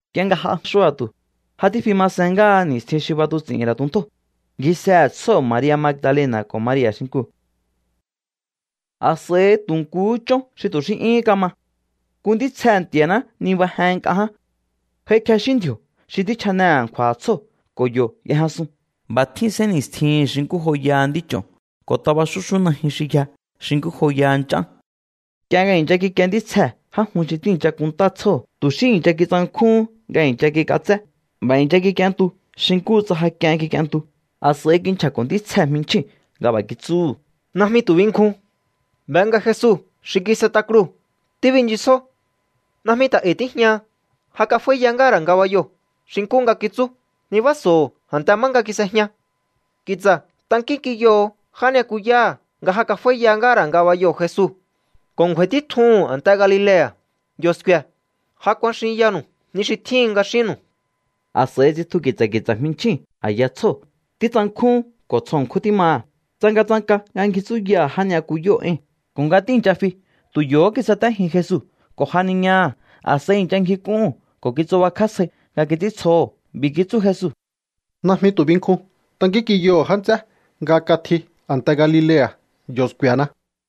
Nk'ie nga j'a xua̱tu̱, ja tífi ma sen ngáha ni̱stjin xi b'atuts'i̱hi̱n ra̱ tuntjóo̱, ngjisehe̱ tsjóo̱ Maria̱ Magdalena̱ ko̱ Maria̱ xinkuu̱. A̱s'a̱i tu̱ nkuhú chón xi tu̱ xí 'yúhún kama. Nku ntítsjehe̱ Nti̱a̱ná nibajen nk'a ján. J'aikjexín ndji̱o̱ xi tjíchjane a̱nkju̱a̱ha̱ tsjóo̱ ko̱ yo̱ y'ejñasun. Xi nkú joyaha nd'ích'o̱n tjín sénni̱stjihi̱n ko̱ taba xúxú najyun xi yja xi nkú joyaha nch'án. Nk'ie nga i̱ncha kikie ntítsjee̱ já jun xi tíi̱ncha kunntá tsjóo̱, tu̱ xí i̱ncha kitsankjúhún nga i̱ncha kik'atsé. B'a̱ i̱ncha kik'ientu xi nkúhu tsa ja k'ien kik'ientu. A̱s'a̱i kinchja̱ko̱ ntítsjee̱ jminchjíu̱n nga b'a̱ kitsúhu̱: —Najmi tu̱ binkjun. Be nga Jesu xi kis'et'a kruu̱ tíbinchisjó. Najmi ta̱ e̱i̱ tíjñaha. Ja kaf'áíya ngáha̱ ra̱ ngabayoo̱ xi nkú nga kitsú. Nibáha̱so̱o a̱nte má nga kis'ejña. Ki̱tsa̱ tankínk'inyoho̱o já ni'yakuyáha̱ nga ja kaf'áíya ngáha̱ ra̱ ngabayoo̱ Jesu ko̱ ngju̱a̱i̱ títjuhu̱n a̱nte Galilea̱. Yo̱ sku̱e̱. Ja kuaxinyanu̱u ni xi tjíhin nga xínnu̱u. A̱s'a̱i tsitju ki̱tsa̱ ki̱tsa̱ jminchjíu̱n a̱ya tsjóo̱. Títsankjún ko̱ tsjo ṉkjún tímaha̱. Tsangatsanka nga ngji tsúyaha̱ já ni'yakuyóo̱ ée̱n. Ko̱ nga tíi̱ncha fi, tu̱ yo̱hó kisatéjin Jesu ko̱ janiñaha̱. A̱s'a̱i i̱ncha ngjik'úhu̱n ko̱ kitsubakjá sjai nga kits'íntsjoho̱. B'i̱ kitsú Jesu: —Najmi tu̱ binkjun. Tankínk'inyoho̱o já nts'é nga katji a̱nte Galilea̱. Yo̱ sku̱e̱na.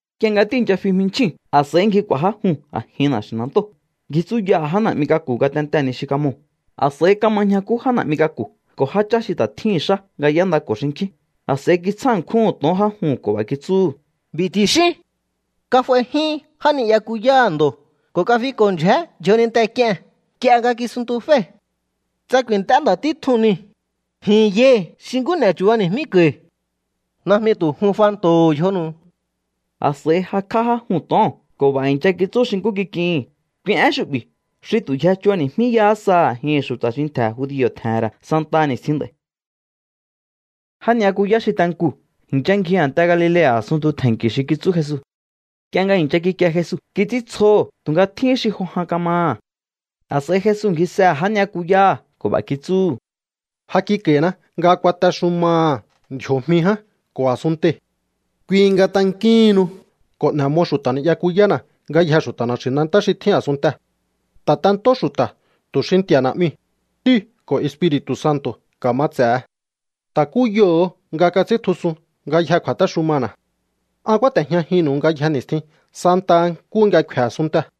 Nk'ie nga tíi̱ncha fi jminchjíu̱n, a̱s'a̱i ngji k'u̱a̱ já juu̱n a̱jin na̱xi̱nantóo̱. Ngji tsúyaha̱ já na̱'mi k'aku̱ ngatentee̱ ni xi kamoo̱. A̱s'a̱i kama ñjakú já na̱'mi k'aku̱ ko̱ jáchá xi ta̱ tjíhi̱n xá nga y'éndako̱ xinkjín. A̱s'a̱i kitsjá ṉkjúhu̱n to̱on já juu̱n ko̱ b'a̱ kitsúhu̱: —B'i̱ ti̱xíún: “Kaf'aijyún já ni'yakuyáha̱ ndo̱ ko̱ kafiko̱ ndyjé yjoninte k'ie̱n nk'ie nga kisuntuféi̱.” Tsa ku̱i̱nt'é nda̱ títjuu̱n niu̱, ji̱n yai̱ xi nkú n'e̱ chu̱bani̱jmíko̱i̱. Najmi tu̱ jun fanto̱ho̱ yjonu̱u. A̱s'a̱i jakj'á já juu̱n to̱oo̱n ko̱ b'a̱ i̱ncha kitsú xi nkú kik'ihi̱n. Kui én xu'bi̱ xi tu̱ yje chubani̱jmíyahá sa a̱jihi̱n xu̱ta̱ xi ntje̱ judio̱ tje̱he̱n ra̱ santaha ni̱stjin nd'a̱i̱. Já ni'yakuyá xi te nkuu̱ i̱ncha ngji a̱nte Galilea̱ a̱sunntu tje̱nki̱ xi kitsú Jesu. Nk'ie nga i̱ncha kikie Jesu, kits'íntsjoho̱, tu̱nga tjíhín xi jo jan kamaha̱. A̱s'a̱i Jesu ngjisehe̱ já ni'yakuyáha̱ ko̱ b'a̱ kitsúhu̱: —Ja kik'a̱i̱na nga kuatexumaha̱ ndji̱o̱jmi ján ko̱ a̱sunntei̱. Kui nga tankíhinnu ko̱ n'e̱ mo xu̱ta̱ ni'yakuyána̱ ngayjee̱ xu̱ta̱ na̱xi̱nantá xi tjín a̱sunntee̱. Ta̱tentó xu̱ta̱ tu̱ xi Nti̱a̱ Na̱'miu̱, Ntíu̱ ko̱ Espiri̱tu̱ Santo̱ ka̱mats'e̱he. Ta̱kúyoho̱o nga kats'íntjusun ngayjee̱ kju̱a̱téxumana̱. An kúáte̱jñajinnu̱u ngayje ni̱stjin santaha nkúhu nga kfe̱ a̱sunntee̱.